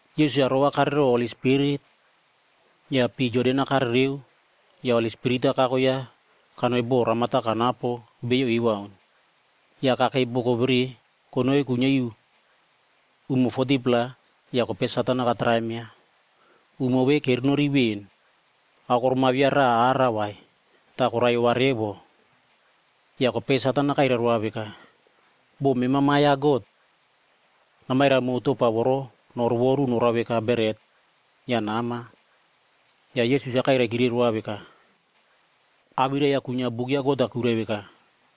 Yesus-a rovakare row Holi Spirit, ya pii Jordan-a karereo ya Holi Spirit-a kako yaꞌa kanoi bo ramata kanapo beiyo ewaun. Ya kakei boko vere konoi kuinyia iu umo 40-pla ya kopei Satan-a katraim yaꞌa. Umo ve kerenori ven, aokorom-a via raꞌa ara vai, ta koraiyova revo. Ya kopei Satan-a kairai roa veka, “Bo mema Ma Biam ya God, namairai mow topa voro norovoru norao veka beret ya nama.” Ya Yesus-a kairaikire roa veka, “Awirai-ya kuinyia buk ya God-a kuirai veka,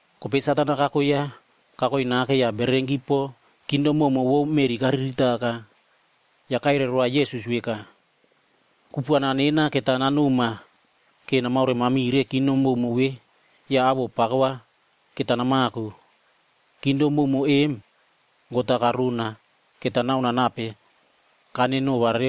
Kopei Satan-a kako yaꞌa kakoi nake ya bererenki po kingdom mowmow vou bo meꞌri kariritaka. Ya kairai roa Yesus veka, “Kupuana nena keta nanoma ke namaoremamire kingdom mowmow ve ya awoꞌo pako va keta namako. Kingdom mowmow em God-a karona keta naonoa nape kanerenova.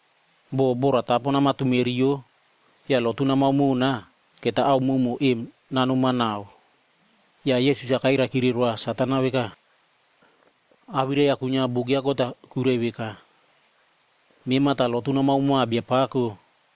Bo boratapo namatumeriyo ya lotu namao mona, keta ao mowmow em nanoma nau.” Ya Yesus-a kairaikire roa Satan-ab veka, “Awirai-ya kuinyia Buk ya God-a kuirai veka, ‘Mema ta lotu namao moa Biapako,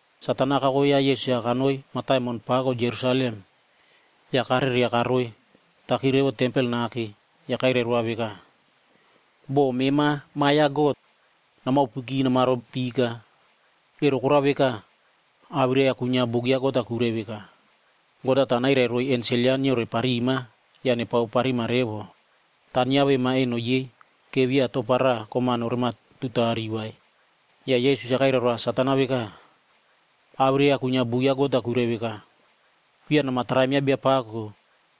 Satan-a kako yaꞌa Yesus-a kanoi mataimon pako Jerusalem ya kareria karoitaki revo tempel nake ya kairai roa veka, “Bo mema Ma Biam ya God, namaopuki namaro pika. Ero korao veka, awirai-ya kuinyia Buk ya God-a kuirai veka, ‘God-a ta nairai roiy ensel yaꞌa nyioreparima ya nepaoparima revo. Ta nyiavema eno yei ke via topa raꞌa kom-a norematutari vai.’”d Ya Yesus-a kairai roa Satan-a veka, “Awirai-ya kuinyia Buk ya God-a kuirai veka, ‘Via nama traim ya Biapako,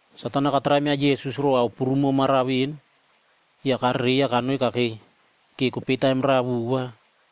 Satan-a katraim yaꞌa Yesus row ao prumo maramara ven, ya karereiya kanoi kakei keiya roraꞌa vova.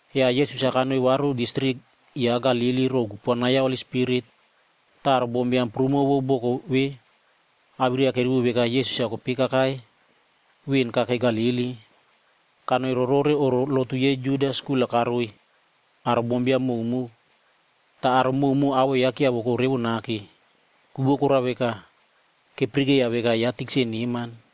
Ya Yesus-a kanoi varu distrik yaꞌa Galili row kupuana ya Holi Spirit. Ta aro bombiam prumo vou boko vere awirai-ya kerivo veka Yesus-a kopei kakai ven kakei Galili. Kanoi rorore oꞌro lotu yei Judaf skul-a karoiy aro bombiam mowmow. Ta aro mowmow awoꞌo yaꞌa kyiavoko revo nake. Ku vou korao veka, kepirikeiya veka yaꞌa tikse neman.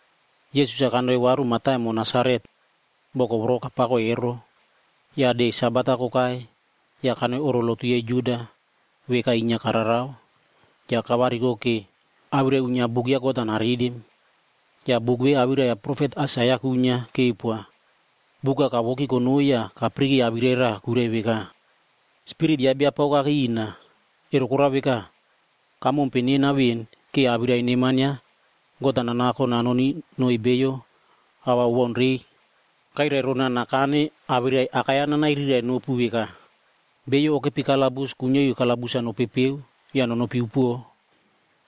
Yesus-a kanoi varu mataimon Nasaret boko voro kapako ero. Ya de Sabat-ag kokai ya kanoi oꞌro lotuh yei Juda, veka inyia kararao. Ya kavariko karoi ke awirai uinyia Buk ya God-a naritim. Ya buk ve awirai ya profet Aisaia kuinyia keupoa. Buk-a kavoki konoi ya kapirike awirai raꞌa kuirai veka, “Spirit ya Biapako kakei ina, ero korao veka, kamompe nena ven ke awirai neman ya God-a nanako nanoni noiy beiyo ao va owaunrei. Kairai rona nakane awirai awakai-ya nanairirai nopu veka, ‘Beiyo okepi kalabus kuinyia iu kalabus-a nopepeo ya nonopi upuo,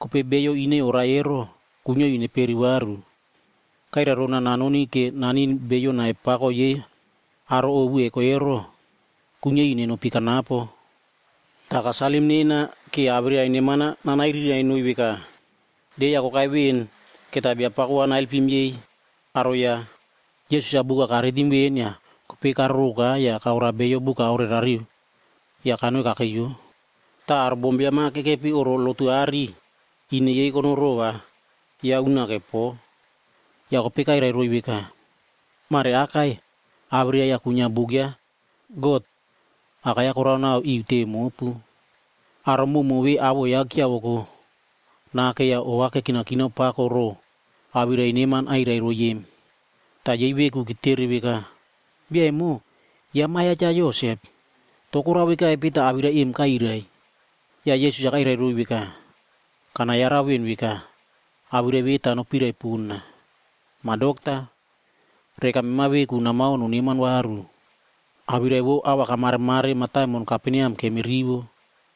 kopei beiyo ine taipo, kuinyia iu neperi varu.’ Kairai rona nanoni ke nanin beiyo nai pako yei aro ovu eko ero, kuinyia iu nenopi kanapo. Ta kasalim nena ke awirai neman-a nanairirai noiy veka de-ya kokai ven keta Biapako va naelpim yei aro yaꞌa.”i Yesus-a buk-a karitim ven ya kopei karoroka ya kaoroa bio buk-a aorerariu ya kanoi kakeiyo.j Ta aro bombiam-a kekepi oꞌro lotu aꞌari, ine yei konoi rova yaꞌa unake po. Ya kopei kairai roiy veka, “Mareakai awirai-ya kuinyia Buk ya God akai-ya koraonao iu teve mopu.” Aro mowmow ve awoꞌo yaꞌa kyiavoko nake ya ova kekinakinao pako row awirai neman airai roiy em. Ta yei veku ketere veka, “Bia emo, yaꞌa ma ya Cha Yosep. To korao vekaipe ta awirai em kairai?” Ya Yesus-a kairai roiy veka, “Kanayarau ven veka, awirai ve ta nopirai pona, ‘Ma Dokta, reka mema veku namao noneman varu. Awirai vou ao va kamaremare mataimon Kaperneam kemirivo.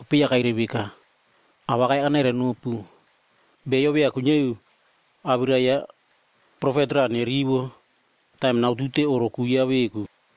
Ya kairai veka, “Awakai-ya kanairai nopu. Beiyo via kuinyia iu awirai ya profet raꞌa nerivo taim nautute oꞌro ku yaꞌa veku.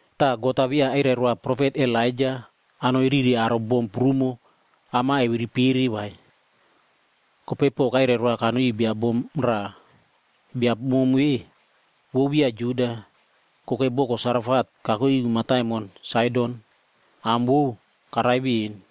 Ta God-a via asalim yaꞌa profet Elaija anoi rire aro bom prumo am-a eviripere vai. Kopei po kasalim yaꞌa kanoi iu pon bia bom raꞌa. Bia bom ve, vou via Juda. Kokei boko Sarefatl kakuke iu mataimon Saidon, am vou karai ven.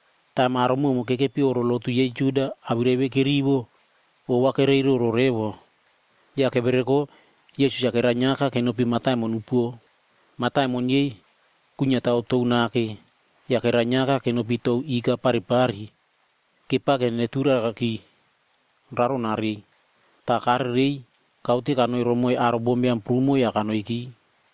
Taim aro mowmow kekepi oꞌro lotu yei Juda awirai ve kerivo, ova koreiroro revo. Ya kevereko Yesus-a kerainyiaka kenopi mataimon upuo. Mataimon yei kuinyiatao tou, ya kerainyiaka kenopi tou ika paripari kepake neturakaki raronarei. Ta karerei kaute kanoi romoiy aro bombiam prumo ya kanoi kawaunki.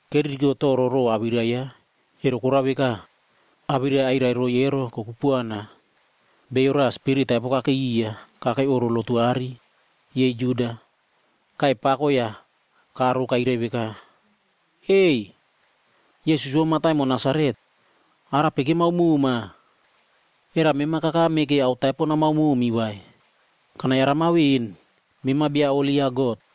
Keririko toro row awirai yaꞌa, ero korao veka, awirai airai roiy ero kokupuana. Bio raꞌa spirit taipo kakei iya kakei oꞌro lotu aꞌari yei Juda. Kaiy pako ya karo kairai veka, “Ei! Yesus vou mataimon Nasaret, arape kemao moma? Era mema kakame ke ao taipo namao momi vai? Kanayarama ven, mema Bia Holi ya God.”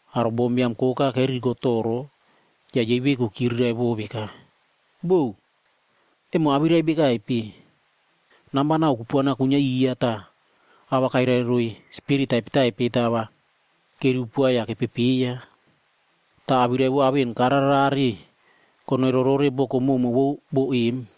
Aro bombiam koka keririko toro ya yei veku kyirirai veka, “Bou, emo awirai bekaipe? Namba nau kupuana kuinyia iya ta, a va kairai roiy spirit taipetaipe ta a va kerivo poa ya kepepeiya.” Ta awirai vou ao en kararerare konoi rorore boko mowmow vou bo em.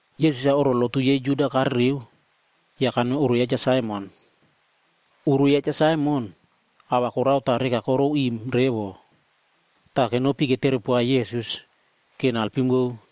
Yesus-a oꞌro lotu yei Juda karereo, ya kanoi oꞌro ya Cha Saimon. Oꞌoro ya Cha Saimon, a va korao ta reka koroim revo. Ta kenopi ketere poa Yesus ke nalpim vou.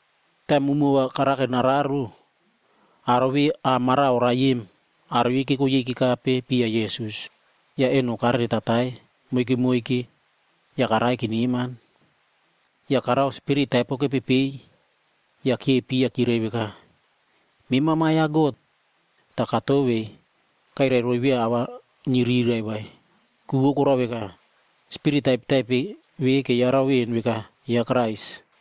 Taim umo va karake nararo, aro ve a mara oraie em, aro yei keko yei kekape piya Yesus. Ya eno kareretatai moike moike ya karaie keneman. Ya karao spirit taipo kepepei ya kyepi kyirai veka, “Mema Ma Biam ya God.” Ta katovei kairai roiy via a va nyirirai vai. Ku vou korao veka, spirit taipetaipe ve keyarau ven veka yaꞌa Krais.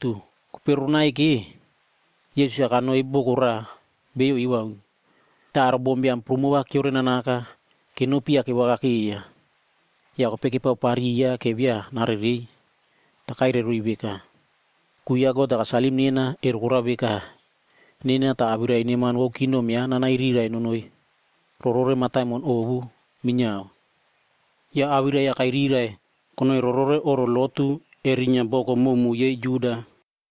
Kopei roronaike, Yesus-a kanoi boko raꞌa beiyo ewaun. Ta aro bombiam prumo va kyiorenanaka kenopi ya kevakakeiya. Ya kopei kepaopariya ke via narerei. Ta kairaiki roiy veka, “Ku ya God-a kasalim nena, ero korao veka, nena ta awirai neman vou kingdom yaꞌa nanairirai nonoi rorore mataimon ovu minyiao.” Ya awirai-ya kairirai konoi rorore oꞌro lotu erinyia boko mowmow yei Juda.